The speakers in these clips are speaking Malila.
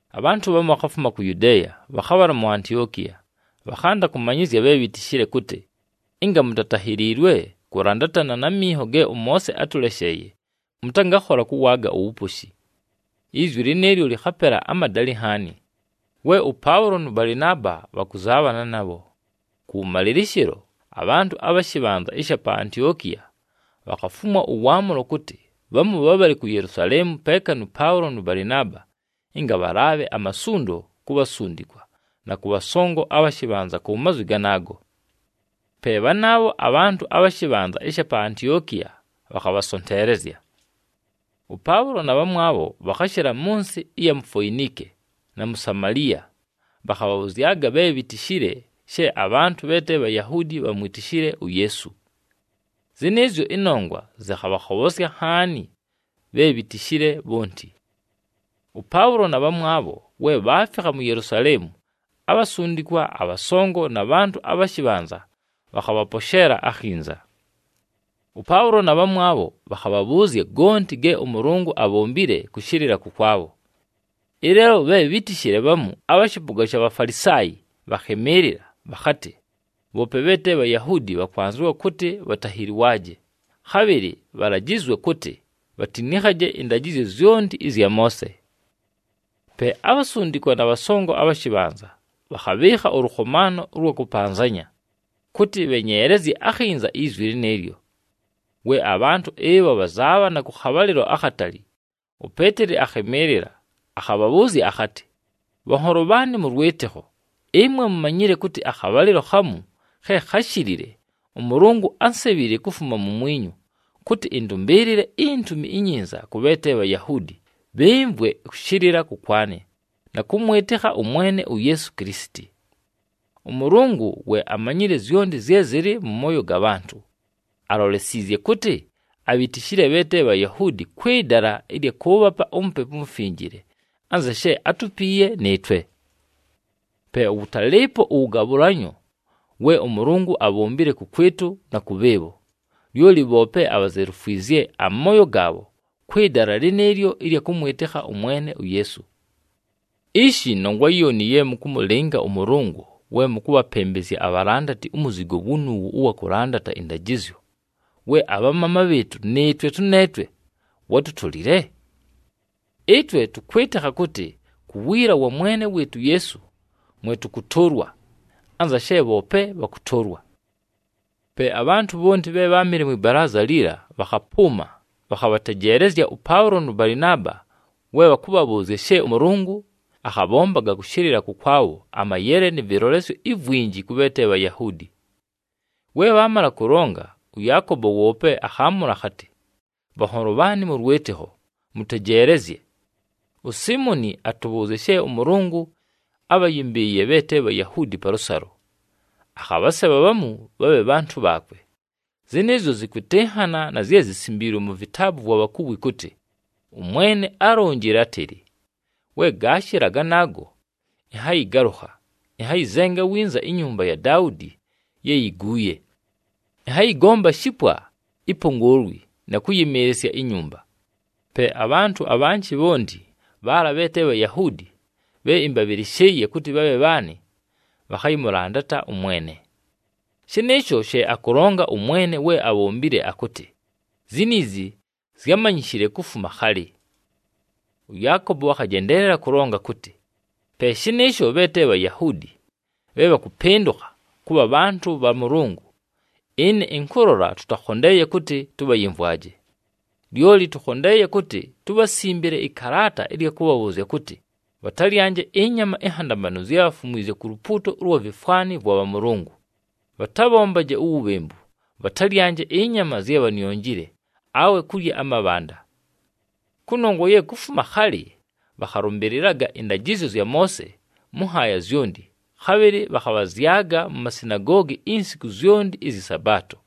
Abhantʉ bhamu bhakhafuma ku Yudeeya, bhakhabhala mu Antiokiya. Bhakhanda kʉmanyɨzya bhe bhitishile kʉtɨ, “Ɨnga mutatahiliilwe kʉlandatana na minho ge ʉMoose atʉlesheeye, mʉtangakhola kʉwaaga uwuposhi.” Izwi lɨnɨɨlyo lɨkhapela amadalɨ nhaani, we ʉPaʉlo nʉ Balɨnaaba bhakʉzaabhana nabho. Kʉwʉmalɨlɨshɨlo, abhantʉ abha shɨbhanza ɨsha pa Antiokiya bhakhafumwa ʉwaamʉlo kʉtɨ bhamu bhabhale ku Yelusaleemu peeka nʉ Paʉlo nʉ Balɨnaaba, ɨnga bhalaabhe amasundo ku bhasundikwa na kʉ bhasongo abha shɨbhanza ku mazwi ganaago. Pe bhanaabho abhantʉ abha shɨbhanza ɨsha pa Antiokiya bhakhabhasonteelezya. ɄPaʉlo na bhamwabho bhakhashɨla mʉ nsɨ ɨya mu Foinike, na mu Samaliya, bhakhabhabhʉzyaga bhe bhitishile she abhantʉ bhe te Bhayahuudi bhamwitishile uYeesu. Zɨnɨɨzyo ɨnongwa zɨkhabhakhobhosya nhaani bhe bhitishile bhonti. ɄPaʉlo na bhamwabho, we bhaafikha mu Yelusaleemu, abhasundikwa, abhasongo na bhantʉ abha shɨbhanza bhakhabhaposheela akhinza. ɄPaʉlo na bhamwabho bhakhabhabhʉʉzya gonti ge ʉMʉlʉngʉ abhombile kʉshɨlɨla kʉkwabho. Ɨleelo bhe bhítishile bhamu abha shɨpʉga sha Bhafalisaayi bhakhɨmɨɨlɨla, bhakhatɨ, “Bhoope bhe te Bhayahuudi bhakwanzɨwa kʉtɨ bhatahiliwaaje, khabhɨlɨ bhalajɨzwe kʉtɨ bhatinikhaje ɨndajɨzyo zyonti ɨzya Moose.” Pe abhasundikwa na bhasongo abha shɨbhanza bhakhabhɨɨkha ʉlʉkhomaano ʉlwa kʉpanzanya, kʉtɨ bhenyeelezye akhinza izwi lɨnɨɨlyo. We abhantʉ ɨbho bhazaabhana kʉ khabhalɨlo akhatali, uPeeteli akhɨmɨɨlɨla, akhabhabhʉʉzya akhatɨ, “Bhanholo bhaanɨ mʉ lwɨtɨkho, ɨmwe mumanyile kʉtɨ akhabhalɨlo khamu khe kháshilile ʉMʉlʉngʉ ánsebhile kufuma mumwinyu, kʉtɨ ɨndʉmbɨɨlɨle iNtumi iNyinza kʉ bhe te Bhayahuudi bhɨmvwe kʉshɨlɨla kʉkwanɨ, na kʉmwɨtɨkha ʉMwene uYeesu Kilisiti. ɄMʉlʉngʉ we amanyile zyonti zye zɨlɨ mʉ mooyo ga bhantʉ, alolesiizye kʉtɨ abhitishile bhe te Bhayahuudi kwɨ dala ɨlya kʉʉbhapa uMupepu uMufinjile, anza she átupiiye nɨɨtwe. Pe wʉtalɨɨpo ʉwʉgabhʉlanyo we ʉMʉlʉngʉ abhombile kʉkwɨtʉ na kʉ bhɨɨbho, lyoli bhoope abhazelufwizye amooyo gaabho kwɨ dala lɨnɨɨlyo ɨlya kʉmwɨtɨkha ʉMwene uYeesu. Ishi! Nongwa yooni ye mʉkʉmʉlɨnga ʉMʉlʉngʉ we mʉkʉbhapɨmbɨzya abhalandati umuzigo wunuuwu ʉwa kʉlandata ɨndajɨzyo, we abhamaama bhɨɨtʉ nɨɨtwe tʉneetwe wátutolile! Ɨtwe tʉkwɨtɨkha kʉtɨ ku wiila wa Mwene wɨɨtʉ uYeesu mwe tʉkʉtʉʉlwa, anza she bhoope bhakʉtʉʉlwa.” Pe abhantʉ bhonti bhe bháamɨle mwɨ balaaza liila bhakhapʉʉma, bhakhabhatejeelezya ʉPaʉlo nʉ Balɨnaaba we bhakʉbhabhʉʉzya she ʉMʉlʉngʉ akhabhombaga kʉshɨlɨla kʉkwabho amayele nɨ vɨlolesyo ivwinji kʉ bhe te Bhayahuudi. We bhaamala kʉlonga, ʉYaakobo woope akhaamʉla akhatɨ, “Bhanholo bhaanɨ mʉ lwɨtɨkho, mʉtejeelezye! USiimoni atʉbhʉʉzya she ʉMʉlʉngʉ ábhayɨmbɨɨye bhe te Bhayahuudi palʉsalo, akhabhasebha bhamu bhabhe bhantʉ bhaakwe. Zɨnɨɨzyo zɨkwɨtɨnhana na zye zisimbiilwe mu vitaabu vwa bhakuwi kʉtɨ, ‘ɄMwene álonjile átɨlɨ, “We gaashɨla ganaago, ɨnhayɨgalʉkha, ɨnhayɨzenga winza inyumba ya Daudi ye yiguuye. Ɨnhayɨgomba shipwa ipongoolwi, na kʉyɨmɨɨlɨsya inyumba. Pe abhantʉ abhanjɨ bhonti, bhaala bhe te Bhayahuudi bhe ɨmbabhɨlɨshɨɨye kʉtɨ bhabhe bhaanɨ, bhakhayɨmʉlandata ʉMwene.” Shɨnɨɨsho she akʉlonga ʉMwene, we abhombile akʉtɨ, ziniizi zyámanyishile kufuma khalɨ.’” ɄYaakobo akhajendeelela kʉlonga kʉtɨ, “Pe shɨnɨɨsho, bhe te Bhayahuudi bhe bhakʉpɨndʉkha kʉbha bhantʉ bha Mʉlʉngʉ, ɨne ɨnkʉlola tʉtakhondeeye kʉtɨ tʉbhayɨmvwaje. Lyoli tʉkhondeeye kʉtɨ tubhasimbile ɨkalaata ɨlya kʉbhabhʉʉzya kʉtɨ, bhatalyanje ɨnyama inhandamanu zye bhafumwizye ku lupuuto ʉlwa vifwani vwa bhamʉlʉngʉ, bhatabhombaje uwubhembu, bhatalyanje ɨnyama zye bhanionjile, awe kulya amabhanda. Kʉnongwa ye kufuma khalɨ, bhakhalʉmbɨlɨlaga ɨndajɨzyo zya Moose mʉ nhaaya zyonti, khabhɨlɨ bhakhabhazyaga mu masinagoogi insiku zyonti ɨzyɨ Sabaato.”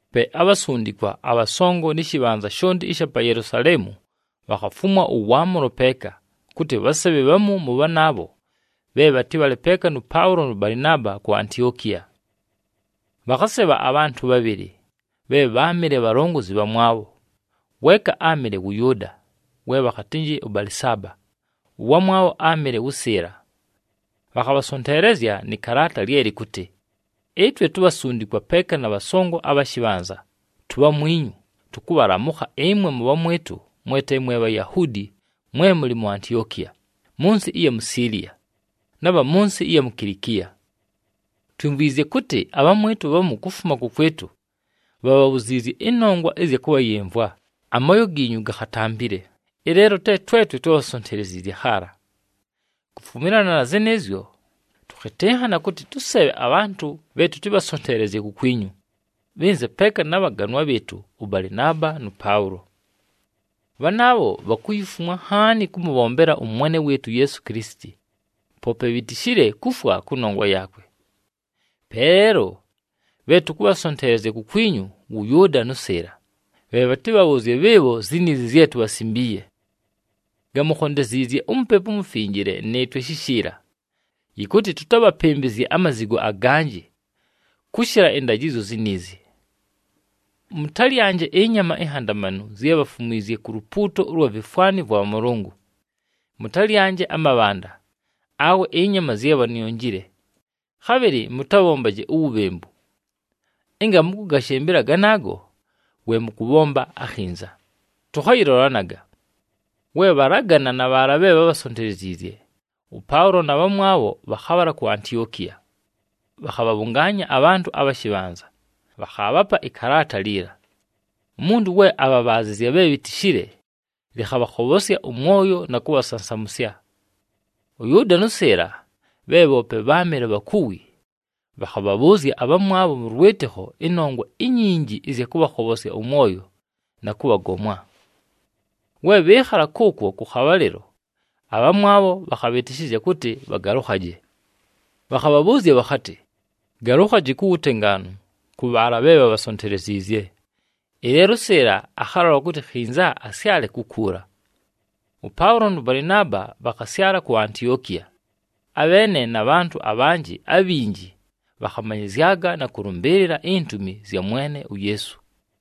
Pe abhasundikwa, abhasongo, nɨ shɨbhanza shonti ɨsha pa Yelusaleemu bhakhafumwa ʉwaamʉlo peeka, kʉtɨ bhasebhe bhamu mʉ bhanaabho bhe bhatɨbhale peeka nʉ Paʉlo nʉ Balɨnaaba ku Antiokiya. Bhakhasebha abhantʉ bhabhɨlɨ, bhe bháamɨle bhalongozi bhamwabho, weeka áamɨle wʉ Yʉʉda, we bhakhatɨnjɨ ʉBalɨsaaba, ʉwamwabho áamɨle wʉ Sɨɨla. Bhakhabhasonteelezya nɨ kalaata lye lɨkʉtɨ: “Ɨtwe tubhasundikwa peeka na bhasongo abha shɨbhanza, tubhamwinyu, tʉkʉbhalamʉkha ɨmwe mʉbhamwɨtʉ mwe te mwe Bhayahuudi mwe mʉlɨ mu Antiokiya, mʉ nsɨ ɨya mu Siiliya, na bha mʉ nsɨ ɨya mu Kilikiya. Twimvwizye kʉtɨ abhamwɨtʉ bhamu kufuma kʉkwɨtʉ bhabhabhuziizye ɨnongwa ɨzya kʉbhayɨmvwa, amooyo giinyu gakhatampile, ɨleelo te twetwe twábhasonteleziizye khaala. Kufumilana na zɨnɨɨzyo, tʉkhɨtɨnhana kʉtɨ tʉsebhe abhantʉ bhe tʉtɨbhasonteelezye kukwinyu, bhɨnze peeka na bhaganwa bhɨɨtʉ ʉBalɨnaaba nʉ Paʉlo. Bhanaabho bhakuyifumwa nhaani kʉmʉbhombela ʉMwene wɨɨtʉ uYeesu Kilisiti, poope bhitishile kufwa kʉnongwa yaakwe. Pe leelo, bhe tʉkʉbhasonteelezya kukwinyu, wʉ Yʉʉda nʉ Sɨɨla, bhe bhatɨbhabhʉʉzye bhɨɨbho ziniizi zye tubhasimbiiye. Gamukhondeziizye uMupepu uMufinjile nɨɨtwe shishiila, yɨkʉtɨ tʉtabhapɨmbɨzye amazigo aganjɨ, kʉshɨla ɨndajɨzyo ziniizi: mʉtalyanje ɨnyama inhandamanu zye bhafumwizye ku lupuuto ʉlwa vifwani vwa bhamʉlʉngʉ, mʉtalyanje amabhanda, awe ɨnyama zye bhanionjile, khabhɨlɨ mʉtabhombaje uwubhembu. Ɨnga mʉkʉgashɨmbɨla ganaago, we mʉkʉbhomba akhinza. Tʉkhayɨlolanaga.” We bhalagana na bhaala bhe bhábhasonteleziizye, ʉPaʉlo na bhamwabho bhakhabhala ku Antiokiya. Bhakhabhabhʉngaanya abhantʉ abha shɨbhanza, bhakhaabhapa ɨkalaata liila. Umuntu we abhabhaazɨzya bhe bhitishile, lɨkhabhakhobhosya ʉmwoyo na kʉbhasansamʉsya. ɄYʉʉda nʉ Sɨɨla bhe bhoope bháamɨle bhakuwi, bhakhabhabhʉʉzya abhamwabho mʉ lwɨtɨkho ɨnongwa inyinji ɨzya kʉbhakhobhosya ʉmwoyo, na kʉbhagomwa. We bhɨɨkhala kʉʉkwo kʉ khabhalɨlo, abhamwabho bhakhabhɨtɨshɨzya kʉtɨ bhagalʉkhaje. Bhakhabhabhʉʉzya bhakhatɨ, “Galukhaji ku wutengaanu kʉ bhaala bhe bhabhasonteleziizye.” [ Ɨleelo ʉSɨɨla akhalola kʉtɨ khinza asyale kukuula.] ɄPaʉlo nʉ Balɨnaaba bhakhasyala ku Antiokiya, abheene na bhantʉ abhanjɨ abhinji bhakhamanyɨzyaga na kʉlʉmbɨɨlɨla intumi zya Mwene uYeesu.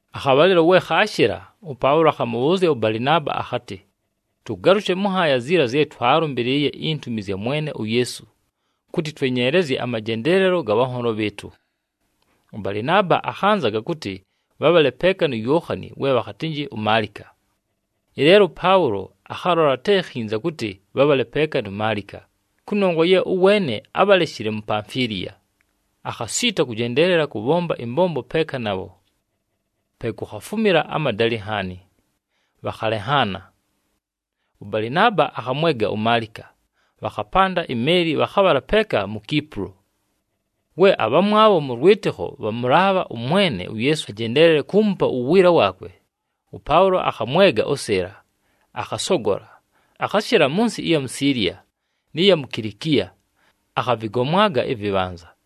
Akhabhalɨlo we khaashɨla, ʉPaʉlo akhamʉbhʉʉzya ʉBalɨnaaba akhatɨ, “Tʉgalʉshe mʉ nhaaya ziila zye twaalʉmbɨlɨɨye intumi zya Mwene uYeesu, kʉtɨ twenyeelezye amajendeelelo ga bhanholo bhɨɨtʉ.” ɄBalɨnaaba akhanzaga kʉtɨ bhabhale peeka nu Yookhani we bhakhatɨnjɨ uMaalika. Ɨleelo ʉPaʉlo akhalola te khinza kʉtɨ bhabhale peeka nu Maalika, kʉnongwa ye ʉweene ábhaleshile mu Pamfiliya, akhasiita kʉjendeelela kʉbhomba ɨmbombo peeka nabho. Pe kukhafumila amadalɨ nhaani, bhakhalenhaana. ɄBalɨnaaba akhamwega uMaalika, bhakhapanda imeeli bhakhabhala peeka mu Kipulo. We abhamwabho mʉ lwɨtɨkho bhamʉlaabha ʉMwene uYeesu ajendeelele kuumupa uwiila waakwe, ʉPaʉlo akhamwega ʉSɨɨla, akhasogola. Akhashɨla mʉ nsɨ ɨya mu Siiliya, nɨ ya mu Kilikiya, akhavɨgomwaga ɨvɨbhanza.